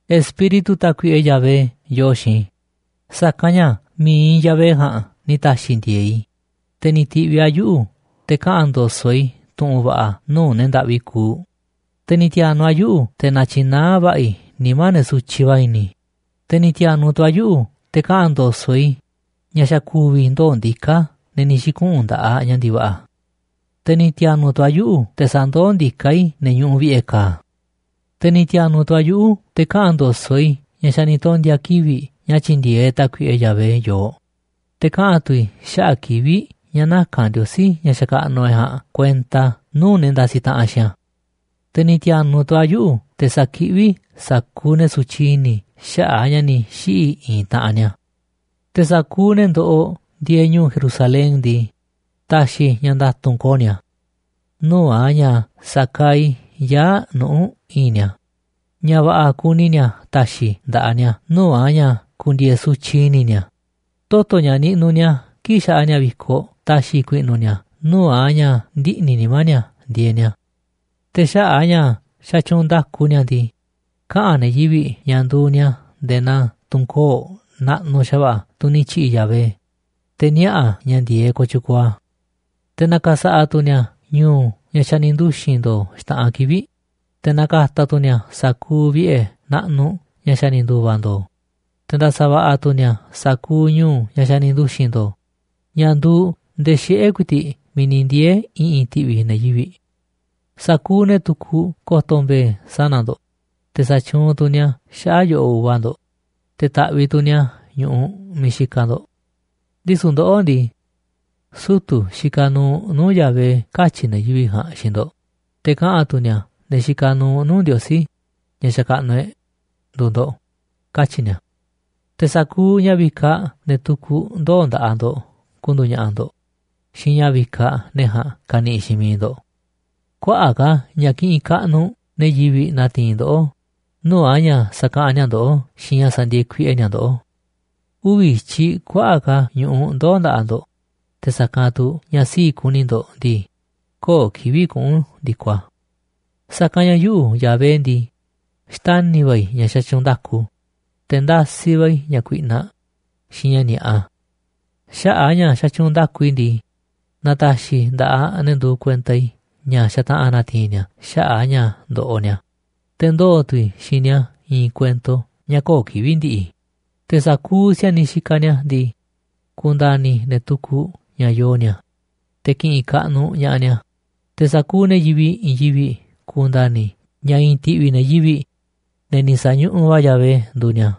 Espíritu Tákuiꞌe Yahvé yoo xiinꞌ i̱, sa̱kanꞌ ña̱ mi̱iꞌ Yahvé ja̱a̱nꞌ ni̱ ta̱xi̱ ndi̱e̱e̱ꞌ i̱, te̱ ni̱ ti̱ꞌviꞌ a̱ yuꞌu̱ te̱ kaꞌa̱n ndo̱so̱ꞌ i̱ tu̱ꞌu̱n va̱ꞌa̱ nuu̱ꞌ ne̱ ndaꞌvi kuuꞌ. Te̱ ni̱ ti̱a̱nu̱ꞌ a̱ yuꞌu̱ te̱ na̱tyi̱naá va̱ꞌa̱ i̱ nimá ne̱ sutyiꞌ va̱ i̱ni̱. Te̱ ni̱ ti̱a̱nu̱ꞌ tu̱ a̱ yuꞌu̱ te̱ kaꞌa̱n ndo̱so̱ꞌ i̱ ña̱ xa̱ ku̱vi̱ ndoo̱ ndiká ne̱ ni̱ xi̱kuꞌu̱n nda̱ꞌaꞌ ña̱ ndi̱va̱ꞌa̱. Te̱ ni̱ ti̱a̱nu̱ꞌ tu̱ a̱ yuꞌu̱ te̱ sa̱ndoó ndiká i̱ ne̱ ñuꞌuꞌ vi̱ꞌe̱ ka̱a̱. Te̱ ni̱ ti̱a̱nu̱ꞌ tu̱ a̱ yuꞌu̱ te̱ kaꞌa̱n ndo̱so̱ꞌ i̱ ña̱ xa̱ ni̱ tondi̱a̱ kivi̱ꞌ ña̱ tyi̱ndi̱e̱eꞌ Tákuiꞌe Yahvé yooꞌ. Te̱ kaꞌa̱n tu̱ i̱ xaꞌa̱ꞌ kivi̱ꞌ ña̱ naka̱n Ndiosí, ña̱ xakaꞌnuꞌ e̱ꞌ ja̱a̱nꞌ, kuenta nuu̱ꞌ ne̱ ndasiꞌ taꞌanꞌ xiinꞌ a̱. Te̱ ni̱ ti̱a̱nu̱ꞌ tu̱ a̱ yuꞌu̱ te̱ sa̱kiꞌví i̱ sa̱kuuꞌ ne̱ sutyiꞌ i̱ni̱ xaꞌa̱ꞌ a̱ ña̱ ni̱ xiꞌi̱ i̱i̱n taꞌanꞌ ni̱a̱. Te̱ sa̱kuuꞌ ne̱ ndoꞌoꞌ ndieeꞌ ñu̱u̱ Jerusalén ndii, ta̱xi̱ i̱ ña̱ nda̱tu̱nꞌ ko̱o̱ ni̱a̱, nuu̱ꞌ a̱ ña̱ sa̱kaaꞌ i̱ yaa̱ꞌ nuꞌu̱ i̱i̱nꞌ ni̱a̱, ña̱ va̱ꞌa̱ kuni ni̱a̱ ta̱xi̱ i̱ nda̱ꞌaꞌ ni̱a̱ nuu̱ꞌ a̱ ña̱ ku̱ndi̱e̱e̱ sutyiꞌ i̱ni̱ ni̱a̱, toto̱ ña̱ niꞌnuꞌ ni̱a̱ kii̱ꞌ xaꞌa ni̱a̱ vi̱koꞌ ta̱xi̱ i̱ ku̱i̱ꞌnu̱ ni̱a̱ nuu̱ꞌ a̱ ña̱ ndiꞌni̱ nimá ni̱a̱ ndieeꞌ ni̱a̱. Te̱ xaꞌa̱ꞌ a̱ ña̱ xatyuunꞌ nda̱ku ni̱a̱ ndii, kaꞌa̱n ne̱ yivi̱ꞌ ña̱ nduuꞌ ni̱a̱ nde̱e̱ naa tunꞌ koo̱ꞌ naꞌnuꞌ xa̱va̱ꞌa̱ tunꞌ ni̱ tyi̱ꞌi̱ Yahvé, te̱ niaꞌa̱ a̱ ña̱ ndi̱e̱eꞌ kooꞌ tyukuuꞌ a̱. Te̱ na̱ka̱sa̱ꞌa̱ tu̱ ni̱a̱ ñu̱u̱ ña̱ xa̱ ni̱ nduxi̱n ndo̱o̱ xta̱ꞌanꞌ kivi̱ꞌ, te̱ na̱ka̱ta̱ tu̱ ni̱a̱ sa̱kuuꞌ vi̱ꞌe̱ naꞌnuꞌ ña̱ xa̱ ni̱ ndu̱va̱ ndo̱o̱. Te̱ nda̱sa̱ va̱ꞌa̱ tu̱ ni̱a̱ sa̱kuuꞌ ñu̱u̱ ña̱ xa̱ ni̱ nduxi̱n ndo̱o̱ ña̱ nduuꞌ ndee xiꞌe̱ ku̱i̱ti̱ꞌ miiꞌ ni̱ ndiee̱ i̱ꞌi̱n ti̱ꞌvi̱ ne̱ yivi̱ꞌ. Sa̱kuuꞌ ne̱ tukuꞌ ko̱to̱ mbe̱e̱ sana̱ ndo̱ꞌ, te̱ sa̱tyuunꞌ tu̱ ni̱a̱ xaꞌa̱ꞌ yo̱ꞌoꞌ uva ndo̱ꞌ, te̱ ta̱ꞌviꞌ tu̱ ni̱a̱ ñu̱ꞌuꞌ miiꞌ xikaꞌ ndo̱ꞌ. Ndisu̱ ndoꞌó ndii, sutu̱ xikaꞌ nuuꞌ nuu̱ꞌ Yahvé katyi̱ ne̱ yivi̱ꞌ ja̱a̱nꞌ xiinꞌ ndo̱ꞌ. Te̱ kaꞌa̱n tu̱ ni̱a̱ ne̱ xikaꞌ nuuꞌ nuu̱ꞌ Ndiosí, ña̱ xakaꞌnuꞌ e̱ꞌ, nduuꞌ ndo̱ꞌ, katyi̱ ni̱a̱. Te̱ sa̱kuuꞌ ña̱ vikaꞌ ne̱ tukuꞌ ndoo̱ nda̱ꞌaꞌ ndo̱ꞌ ku̱ndu̱u̱ ña̱ꞌa̱ ndo̱ꞌ xiinꞌ ña̱ vikaꞌ ne̱ ja̱a̱nꞌ ka̱ni̱ꞌi̱ xiinꞌ miiꞌ ndo̱ꞌ. Kuaꞌa̱ꞌ ka̱ ña̱ ki̱ꞌi̱n kaꞌnuꞌ ne̱ yivi̱ꞌ na̱ti̱i̱n ndoꞌó nuu̱ꞌ a̱ ña̱ sa̱kaꞌanꞌ ni̱a̱ ndoꞌó xiinꞌ ña̱ sa̱ndi̱e̱e̱ kuiꞌe ni̱a̱ ndoꞌó. Uvi̱ i̱tyiꞌ kuaꞌa̱ꞌ ka̱ ñu̱ꞌuꞌ ndoo̱ nda̱ꞌaꞌ ndo̱ꞌ, te̱ sa̱kanꞌ tu̱ ña̱ sii̱ꞌ kuni ndo̱ꞌ ndii, köo̱ꞌ kivi̱ꞌ kuꞌu̱n ndi̱koꞌ a̱. “Sa̱kanꞌ ña̱ yuꞌu̱, Yahvé ndii, xtani̱ va̱ i̱ ña̱ xatyuunꞌ nda̱ku, te̱ ndasiꞌ va̱ i̱ ña̱ kuiꞌnaꞌ xiinꞌ ña̱ ni̱a̱ꞌa. Xaꞌa̱ꞌ a̱ ña̱ xatyuunꞌ nda̱ku i̱ ndii, na̱ta̱xi̱ nda̱ꞌaꞌ ne̱ nduuꞌ kuenta i̱ ña̱ xa̱ta̱ꞌa̱n na̱ti̱i̱n ni̱a̱ xaꞌa̱ꞌ a̱ ña̱ ndoꞌoꞌ ni̱a̱, te̱ ndoo̱ tu̱ i̱ xiinꞌ ni̱a̱ i̱i̱n kuento ña̱ köo̱ꞌ kivi̱ꞌ ndi̱ꞌi̱. Te̱ sa̱kuuꞌ si̱a̱niꞌ xikaꞌ ni̱a̱ ndii, ku̱nda̱ni̱ ne̱ tukuꞌ ña̱ yoo ni̱a̱, te̱ ki̱ꞌi̱n kaꞌnuꞌ ña̱ꞌaꞌ ni̱a̱, te̱ sa̱kuuꞌ ne̱ yivi̱ꞌ i̱i̱n yivi̱ꞌ ku̱nda̱ni̱ ña̱ i̱i̱n ti̱ꞌvi̱ ne̱ yivi̱ꞌ, ne̱ ni̱ sa̱ñuꞌuꞌ va̱ Yahvé, nduuꞌ ni̱a̱.”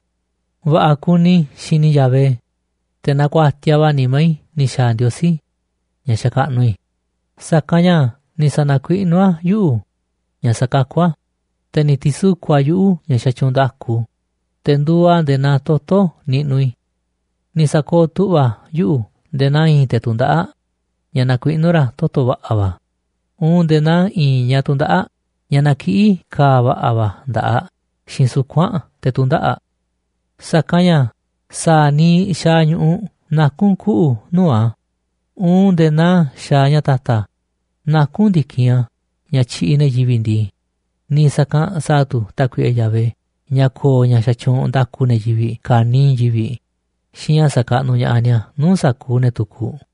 Va̱ꞌa̱ kuni i̱ xini i̱ Yahvé, te̱ nakuatiaꞌ va̱ nimá i̱ ni̱ xa̱a̱ Ndiosí, ña̱ xakaꞌnuꞌ i̱, sa̱kanꞌ ña̱ ni̱ sa̱na̱kuiꞌnú a̱ yuꞌu̱ ña̱ sa̱kakú a̱, te̱ ni̱ ti̱suku̱ꞌ a̱ yuꞌu̱ ña̱ xatyuunꞌ nda̱ku, te̱ nduuꞌ a̱ nde̱e̱ naa toto̱ niꞌnuꞌ i̱. Ni̱ sa̱kooꞌ tu̱ꞌva̱ a̱ yuꞌu̱ nde̱e̱ naa i̱i̱n te̱ tundaꞌáꞌ ña̱ nakuiꞌnú ra̱ toto̱ va̱ꞌa̱ va̱, uun nde̱e̱ naa i̱i̱n ñaꞌ tundaꞌáꞌ ña̱ nakiꞌí ka̱a̱ va̱ꞌa̱ va̱ nda̱ꞌaꞌ aꞌ xiinꞌ suku̱nꞌ aꞌ te̱ tu̱ndaꞌa̱ꞌ aꞌ. Sa̱kanꞌ ña̱ sa̱a̱ niiꞌ xaaꞌ ñu̱ꞌuꞌ nakún kuꞌu̱ nuu̱ꞌ a̱, uun nde̱e̱ naa xaaꞌ ña̱ ta̱ta̱ nakún ndi̱kinꞌ a̱ ña̱ tyiꞌiꞌ ne̱ yivi̱ꞌ ndii, niiꞌ sa̱kanꞌ sa̱a̱ tu̱ Tákuiꞌe Yahvé ña̱ ko̱o̱ ña̱ xatyuunꞌ nda̱ku ne̱ yivi̱ꞌ ka̱niiꞌ i̱i̱n yivi̱ꞌ xiinꞌ ña̱ sa̱kaꞌnuꞌ ña̱ꞌaꞌ ni̱a̱ nuu̱ꞌ sa̱kuuꞌ ne̱ tukuꞌ.